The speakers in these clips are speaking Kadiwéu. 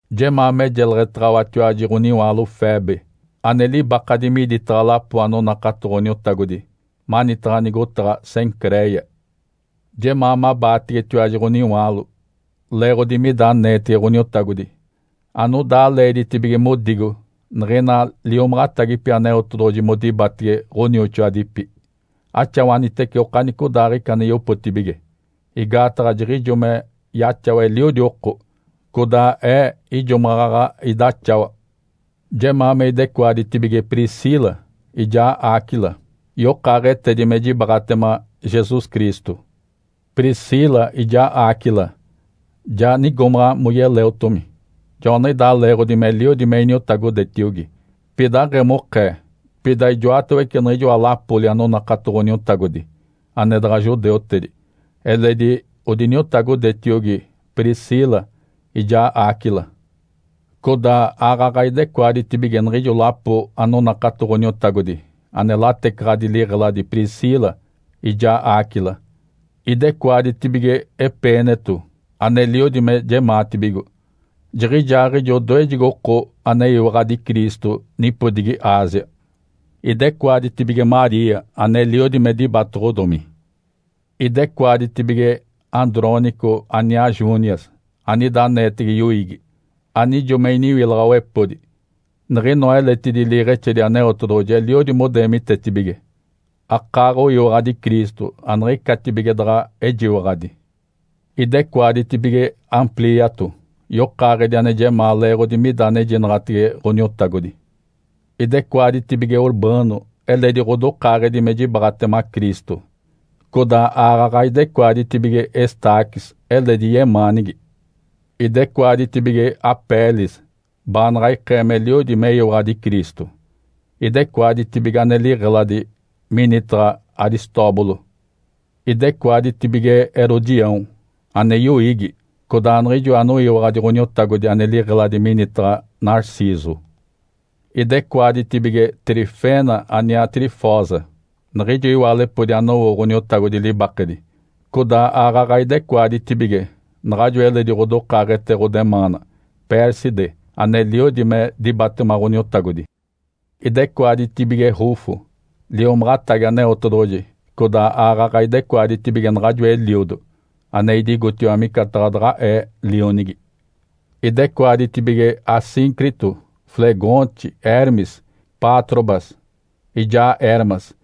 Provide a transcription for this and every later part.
Jemaa me jeleɡ̶etaɡ̶awatiwaji ɡ̶oniwaalo Febe, ane libakadi miditaɡ̶a lapo anonakato Ǥoniotagodi manitaɡ̶a nigotaɡ̶a Cencréia. Jemaa mabaategetiwaji ɡ̶oniwaalo leeɡ̶odi mida aneetege Ǥoniotagodi anodaa leeditibige modigo niɡ̶ina liomaɡ̶atagipi Aneotedoɡ̶oji modibatege ɡ̶onioxoadipi. Axawanitece okanicodaaɡ̶ica ane yopotibige, igaataɡ̶a jiɡ̶ijo me yaxawa eliodi oko, codaa ee ijo maɡ̶aɡ̶a idaxawa. Jemaa me idecoaditibige Priscila ijaa Áquila, yokaaɡ̶etedi me jibaaɡ̶atema Jesus Cristo. Priscila ijaa Áquila ja nigomaɡ̶a moyeleotomi. Joaniɡ̶idaa leeɡ̶odi meliodi me iniotagodetiogi. Pida aɡ̶emokee, pida ijoatawece niɡ̶ijoa lapoli anonakato Ǥoniotagodi ane daɡ̶a judeutedi, eledi odiniotagodetiogi Priscila ijaa Áquila. Codaa aaɡ̶aɡ̶a idecoaditibige niɡ̶ijo lapo anonakato Ǥoniotagodi ane latecaɡ̶adi liɡ̶eladi Priscila ijaa Áquila. Idecoaditibige Epêneto aneliodi me jemaatibigo. Jiɡ̶ijaaɡ̶ijo odoejegi oko aneyiwaɡ̶adi Cristo nipodigi Ásia. Idecoaditibige Maria aneliodi me dibatoɡ̶odomi. Idecoaditibige Andrônico aniaa Júnias anida aneetege yoiigi. Anijo me iniwilaɡ̶awepodi. Niɡ̶inoa eletidi liiɡ̶exedi Aneotedoɡ̶oji eliodi modeemitetibige, akaaɡ̶oyiwaɡ̶adi Cristo aniɡ̶icatibige daɡ̶a ejiwaɡ̶adi. Idecoaditibige Amplíato, yokaaɡ̶edi ane jemaa leeɡ̶odi mida anejinaɡ̶atege Ǥoniotagodi. Idecoaditibige Urbano eledi ɡ̶odokaaɡ̶edi me jibaaɡ̶atema Cristo, codaa aaɡ̶aɡ̶a idecoaditibige Estáquis eledi yemaanigi. Idecoaditibige Apeles baanaɡ̶a ikee meliodi meyiwaɡ̶adi Cristo. Idecoaditibige ane liɡ̶eladi minitaɡ̶a Aristóbulo. Idecoaditibige Herodião ane yoiigi, codaa niɡ̶ijo anoyiwaɡ̶adi Ǥoniotagodi ane liɡ̶eladi minitaɡ̶a Narciso. Idecoaditibige Trifena aniaa Trifosa, niɡ̶ijo iwaalepodi anowo Ǥoniotagodi libakedi. Codaa aaɡ̶aɡ̶a idecoaditibige naɡ̶ajo eledi ɡ̶odokaaɡ̶ete ɡ̶odemaana Pérside aneliodi me dibatema Ǥoniotagodi. Idecoaditibige Rufo liomaɡ̶atagi Aneotedoɡ̶oji, codaa aaɡ̶aɡ̶a idecoaditibige naɡ̶ajo eliodo ane idigotiwa micataɡ̶a daɡ̶a ee lionigi. Idecoaditibige Asíncrito, Flegonte, Hermes, Pátrobas, ijaa Hermas,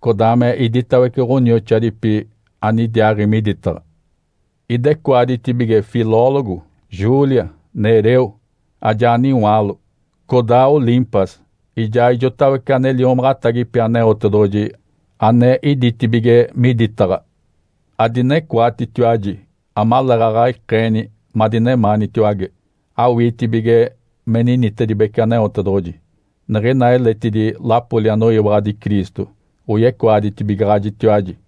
codaa me iditawece ɡ̶onioxoadipi anidiaaɡ̶i miditaɡ̶a. Idecoaditibige Filólogo, Júlia, Nereu ajaa niwaalo, codaa Olimpas ijaa ijotawece ane liomaɡ̶atagipi Aneotedoɡ̶oji ane iditibige miditaɡ̶a. Adinecoatitiwaji amaleeɡ̶aɡ̶a ikeeni madinemaanitiwage, awiitibige me ninitedibece Aneotedoɡ̶oji. Niɡ̶ina eletidi lapoli anoyiwaɡ̶adi Cristo oyecoaditibigaɡ̶ajitiwaji.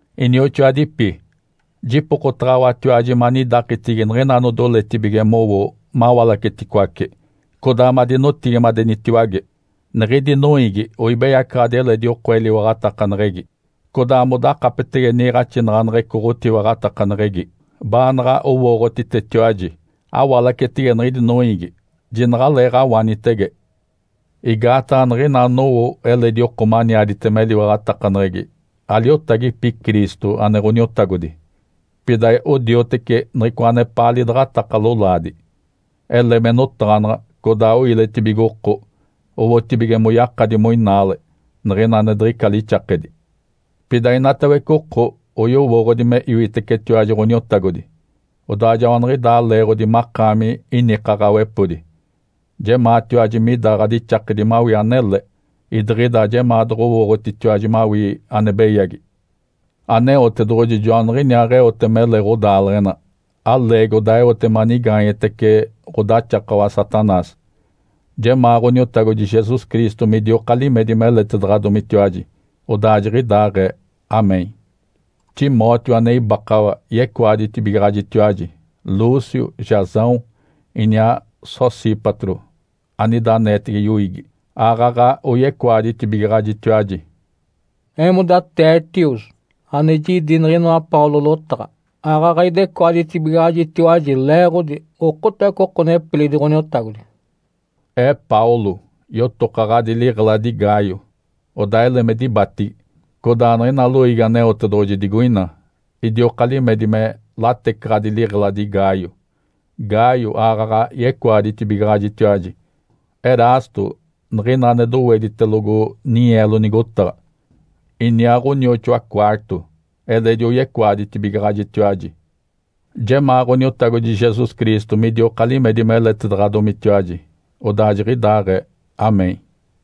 Inioxoadipi. Jipokotaɡ̶awatiwaji manidakitigi niɡ̶ina anodoletibige mowo mawalaceticoace, codaa madinotigimadenitiwage. Niɡ̶idi noiigi oibeyacaɡ̶adi eledi oko eliwaɡ̶atakaneɡ̶egi, codaa modakapetege niiɡ̶axinaɡ̶aneɡ̶eco ɡ̶otiwaɡ̶atakaneɡ̶egi, baanaɡ̶a owooɡ̶otitetiwaji. Awalacetege niɡ̶idi noiigi, jinaɡ̶aleeɡ̶awanitege. Igaataɡ̶a niɡ̶ina anowo eledi oko maniaditema eliwaɡ̶atakaneɡ̶egi aliotagipi Cristo, ane Ǥoniotagodi. Pida odioteci niɡ̶icoa anepaa lidaɡ̶ataka lolaadi. Ele me notaɡ̶anaɡ̶a codaa oiletibigo oko, owotibige moyakadi moinaale niɡ̶ina ane diɡ̶ica lixakedi. Pida inatawece oko oyowooɡ̶odi me iwitecetiwaji Ǥoniotagodi, odaa joaniɡ̶idaa leeɡ̶odi makaami inikaɡ̶awepodi. Jemaatiwaji mida ɡ̶adixakedi mawii anele, idiɡ̶ida ajemaa doɡ̶owooɡ̶otitiwaji mawii ane beyagi. Aneotedoɡ̶oji joaniɡ̶iniaaɡ̶eote mele ɡ̶odaaleɡ̶ena. Aleegi, odaa eote manigaanyetece ɡ̶odaxakawa Satanás. Jemaa Ǥoniotagodi Jesus Cristo midioka limedi meletedaɡ̶adomitiwaji. Odaa jiɡ̶idaaɡ̶ee. (Amém). Timóteo ane ibakawa yecoaditibigaɡ̶ajitiwaji. Lúcio, Jasão, iniaa Sosípatro anida aneetege yoiigi, aaɡ̶aɡ̶a oyecoaditibigaɡ̶ajitiwaji. Eemoda Tertius ane jidi niɡ̶inoa Paulo lotaɡ̶a, aaɡ̶aɡ̶a idecoaditibigaɡ̶ajitiwaji, leeɡ̶odi okotawece oko nepilidi Ǥoniotagodi. Ee Paulo yotokaɡ̶adi liɡ̶eladi Gaio, odaa ele me dibatigi. Codaa niɡ̶ina loiigi Aneotedoɡ̶oji digoina idioka limedi me latecaɡ̶adi liɡ̶eladi Gaio. Gaio aaɡ̶aɡ̶a yecoaditibigaɡ̶ajitiwaji. Erasto, niɡ̶ina ane doweditelogo ninyeelo nigotaɡ̶a, iniaa ɡ̶onioxoa Quarto eledi oyecoaditibigaɡ̶ajitiwaji. Jemaa Ǥoniotagodi Jesus Cristo midioka limedi meletedaɡ̶adomitiwaji. Odaa jiɡ̶idaaɡ̶ee. (Amém).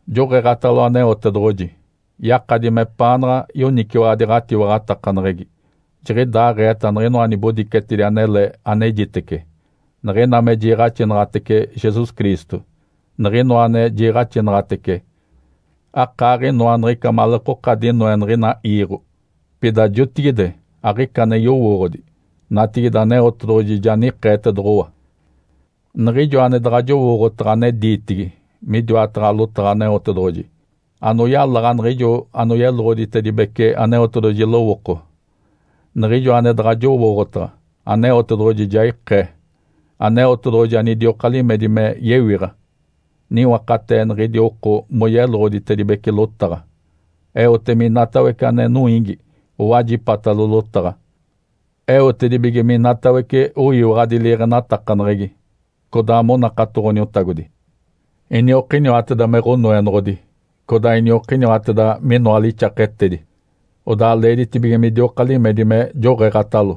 Joɡ̶eeɡ̶atalo Aneotedoɡ̶oji. Yakadi mepaanaɡ̶a yoniciwaɡ̶adi ɡ̶atiwaɡ̶atakaneɡ̶egi. Jiɡ̶idaaɡ̶eeta niɡ̶inoa nibodicetedi anele anejitece, niɡ̶ina me jiiɡ̶axinaɡ̶atece Jesus Cristo. Niɡ̶inoa ane jiiɡ̶axinaɡ̶anaɡ̶atece akaaɡ̶inoa niɡ̶ica maleekoka dinoe niɡ̶ina iiɡ̶o. Pida jotigide aɡ̶ica ane yowooɡ̶odi. Natigide Aneotedoɡ̶oji ja nikeetedoɡ̶owa. Niɡ̶ijo ane daɡ̶a jowooɡ̶otaɡ̶a ane diitigi midiwataɡ̶a lotaɡ̶a Aneotedoɡ̶oji, anoyalaɡ̶a niɡ̶ijo anoyeloɡ̶oditedibece Aneotedoɡ̶oji lowooko, niɡ̶ijo ane daɡ̶a jowooɡ̶otaɡ̶a, Aneotedoɡ̶oji ja ikee. Aneotedoɡ̶oji anidioka limedi me yewiɡ̶a, niwakatee niɡ̶idi oko moyeloɡ̶oditedibece lotaɡ̶a. Eote minatawece ane noiigi owajipatalo lotaɡ̶a, eotedibige minatawece oyiwaɡ̶adi liiɡ̶enatakaneɡ̶egi, codaa monakato Ǥoniotagodi. Iniokiniwateda me Ǥonoenoɡ̶odi, codaa iniokiniwateda minoa lixaketedi. Odaa leeditibige midioka limedi me joɡ̶eeɡ̶atalo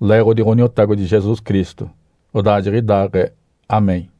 leeɡ̶odi Ǥoniotagodi Jesus Cristo. Odaa jiɡ̶idaaɡ̶ee. (Amém).